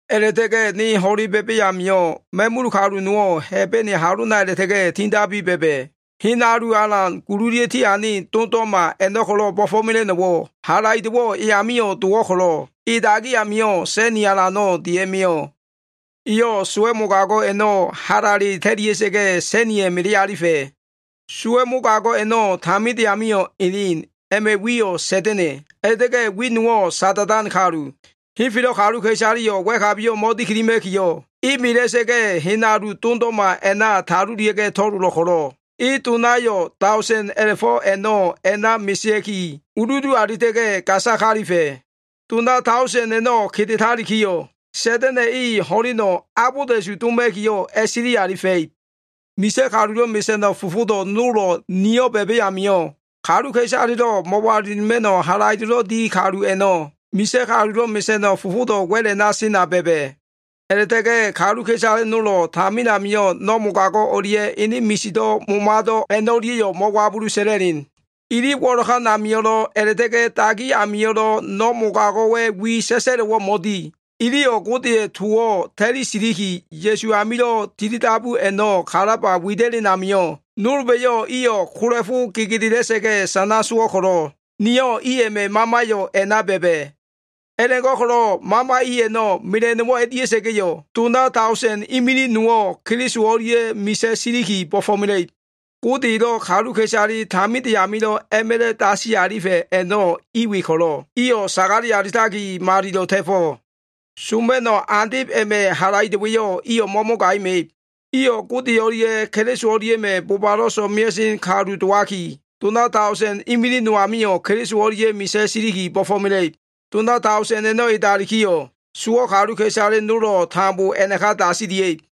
A꞉la꞉ta꞉ga꞉ niyo꞉ ho꞉le ba꞉ba꞉ amio꞉, ma꞉mul kalu nowo꞉ Hebene halona a꞉la꞉ta꞉ga꞉ tindabiki ba꞉ba꞉. Hen alu alan gululia꞉ tiane dondo꞉ma a꞉no꞉ ko꞉lo꞉ bo꞉fo꞉mela꞉no꞉wo꞉, halaido꞉wo꞉ e amio꞉ dowo꞉ ko꞉lo꞉, e dagi amio꞉ sa꞉ni alano꞉ dia꞉mio꞉. Eyo꞉ sowa꞉ mogago꞉ a꞉no꞉ halale ta꞉lia꞉sa꞉ga꞉ sa꞉niya꞉ melealifa꞉. Sowa꞉ mogago꞉ a꞉no꞉ taminde amio꞉ elen, a꞉ma꞉ wiyo꞉ Sa꞉da꞉na꞉, a꞉la꞉ta꞉ga꞉ wi nowo꞉ “Sada꞉dan Kalu.” Henfelo꞉ kaluka꞉isaleyo꞉ wa꞉kabiyo꞉ mo꞉dikilima꞉kiyo꞉, e mela꞉sa꞉ga꞉, hen alu dondo꞉ma a꞉na talulia꞉ga꞉ to꞉lolo꞉ ko꞉lo꞉, e donayo꞉ daosen a꞉la꞉fo꞉ a꞉no꞉ a꞉na mesea꞉ki, uludu alifa꞉. Dona daosen a꞉no꞉ kedetalikiyo꞉, Sa꞉da꞉na꞉ e ho꞉leno꞉ abolda꞉su doma꞉kiyo꞉, a꞉silialifa꞉ib. Misa꞉ kalulo꞉ mesa꞉no꞉ fofodo꞉ nolo꞉ niyo꞉ ba꞉ba꞉ amio꞉, kaluka꞉isalelo꞉ mo꞉walilima꞉no꞉ halaido꞉lo꞉ di kalu a꞉no꞉ misa꞉ kalulo꞉ mesa꞉no꞉ fofodo꞉ wa꞉l a꞉na sena ba꞉ba꞉. A꞉la꞉ta꞉ga꞉ kaluka꞉isale nolo꞉ tamin amio꞉ no꞉ mogago꞉ o꞉lia꞉, ene misido꞉ momado꞉ a꞉no꞉lia꞉yo꞉ mo꞉wabulu sa꞉la꞉len. Ili wo꞉lokan amio꞉lo꞉, a꞉la꞉ta꞉ga꞉ dagi amio꞉lo꞉ no꞉ mogago꞉wa꞉ wi sa꞉sa꞉lo꞉wo꞉ mo꞉di. Iliyo꞉ Godeya꞉ towo꞉ ta꞉li siliki, Ya꞉su amilo꞉ tilidabu a꞉no꞉ kalaba wida꞉len amio꞉, nolba꞉yo꞉ iyo꞉ kola꞉fo gegedela꞉sa꞉ga꞉ sana sowo꞉ ko꞉lo꞉, niyo꞉ i a꞉ma꞉ mamayo꞉ a꞉na ba꞉ba꞉. A꞉la꞉go꞉ko꞉lo꞉ mama i a꞉no꞉ mela꞉no꞉wo꞉ a꞉dia꞉sa꞉ga꞉yo꞉, dona daosen imilig nowo꞉ Keliso o꞉lia꞉ misa꞉ siliki bo꞉fo꞉mela꞉ib. Gode elo꞉ kaluka꞉isale taminde amilo꞉ a꞉ma꞉la꞉ dasi alifa꞉ a꞉no꞉ i we ko꞉lo꞉, iyo꞉ sagale alitaki, malilo꞉ ta꞉fo꞉. Soma꞉no꞉ andeb a꞉ma꞉ halaido꞉wa꞉yo꞉ iyo꞉ mo꞉mogaima꞉ib. Iyo꞉ Gode o꞉lia꞉ Keliso o꞉lia꞉ma꞉ bobalo꞉ so꞉mea꞉sen kalu dowaki, dona daosen imilig no amio꞉ Keliso o꞉lia꞉ misa꞉ siliki bo꞉fo꞉mela꞉ib. Dona daosen a꞉no꞉ edalikiyo꞉, sowo꞉ kaluka꞉isale nolo꞉ tambo a꞉naka dasilia꞉ib.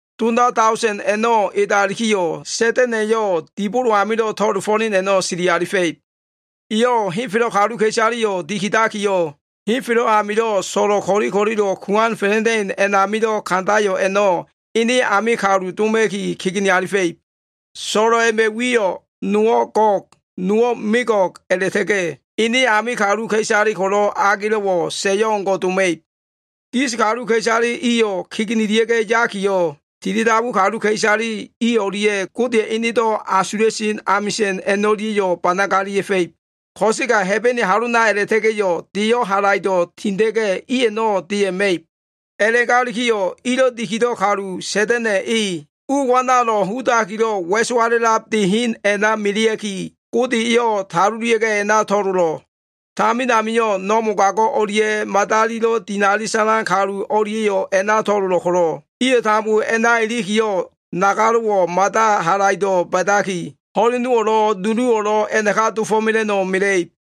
Dona daosen a꞉no꞉ edalikiyo꞉, Sa꞉da꞉na꞉yo꞉ dibolo amilo꞉ to꞉lofo꞉len a꞉no꞉ sili alifa꞉ib. Eyo꞉ henfelo꞉ kaluka꞉isaleyo꞉ dikidakiyo꞉, henfelo꞉ amilo꞉ so꞉lo꞉ ko꞉li ko꞉lilo꞉ kuan fa꞉la꞉da꞉in a꞉namilo꞉ kandayo꞉ a꞉no꞉ ene ame kalu doma꞉ki, kegene alifa꞉ib. So꞉lo꞉ a꞉ma꞉ wiyo꞉ nowo꞉ Gog, nowo꞉ Megog a꞉la꞉ta꞉ga꞉ ene ame kaluka꞉isale ko꞉lo꞉ agelo꞉wo꞉ sa꞉yo꞉ o꞉ngo꞉ doma꞉ib. Gis kaluka꞉isale iyo꞉ kegenelia꞉ga꞉ yakiyo꞉, tilidabu kaluka꞉isale i o꞉lia꞉ Godeya꞉ enedo꞉ asula꞉sen amisa꞉n a꞉no꞉lia꞉yo꞉ banagalia꞉fa꞉ib. Ko꞉sega Hebene halona a꞉la꞉ta꞉ga꞉yo꞉ deyo꞉ halaido꞉ tinda꞉ga꞉ i a꞉no꞉ deya꞉ ma꞉ib. A꞉la꞉galikiyo꞉ ilo꞉ dikido꞉ kalu Sa꞉da꞉na꞉ e, u wanalo꞉ hudakilo꞉ wa꞉sowala꞉lab de hen a꞉na melea꞉ki, Gode eyo꞉ talulia꞉ga꞉ a꞉na to꞉lolo꞉. Tamin amio꞉ no꞉ mogago꞉ o꞉lia꞉ madalilo꞉ dinali sa꞉lan kalu o꞉lia꞉yo꞉ a꞉na to꞉lolo꞉ ko꞉lo꞉, iyo꞉ tambo a꞉na ilikiyo꞉, nagalo꞉wo꞉ mada halaido꞉ ba꞉daki, ho꞉lenowo꞉lo꞉ nuluwo꞉lo꞉ a꞉naka dofo꞉mela꞉no꞉ mela꞉ib.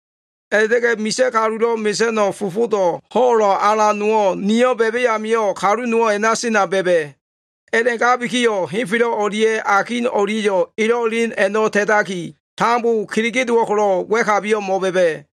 A꞉la꞉ta꞉ga꞉ misa꞉ kalulo꞉ mesa꞉no꞉ fofodo꞉ ho꞉lo꞉ alan nowo꞉ niyo꞉ ba꞉ba꞉ amio꞉, kalu nowo꞉ a꞉na sena ba꞉ba꞉. A꞉la꞉gabikiyo꞉ henfelo꞉ o꞉lia꞉ akin o꞉lia꞉yo꞉ elo꞉ elen a꞉no꞉ ta꞉taki, tambo kelege dowo꞉ ko꞉lo꞉ wa꞉kabiyo꞉ mo꞉ba꞉ba꞉.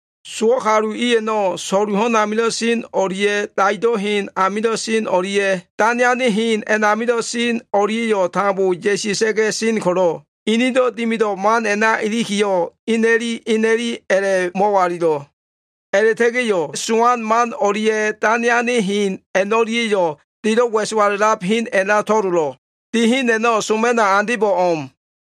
Sowo꞉ kalu i a꞉no꞉, so꞉lu ho꞉n amilo꞉ sen o꞉lia꞉, daido꞉ hen amilo꞉ sen o꞉lia꞉, dane ane hen a꞉namilo꞉ sen o꞉lia꞉yo꞉ tambo ya꞉sia꞉sa꞉ga꞉ sen ko꞉lo꞉, inido꞉ dimido꞉ man a꞉na ilikiyo꞉, ina꞉li ina꞉li a꞉la꞉mo꞉walilo꞉. A꞉la꞉ta꞉ga꞉yo꞉ sowan man o꞉lia꞉, dane ane hen a꞉no꞉lia꞉yo꞉ delo꞉ wa꞉sowala꞉lab hen a꞉na to꞉lolo꞉. De hen a꞉no꞉ soma꞉no꞉ andebo꞉ o꞉m.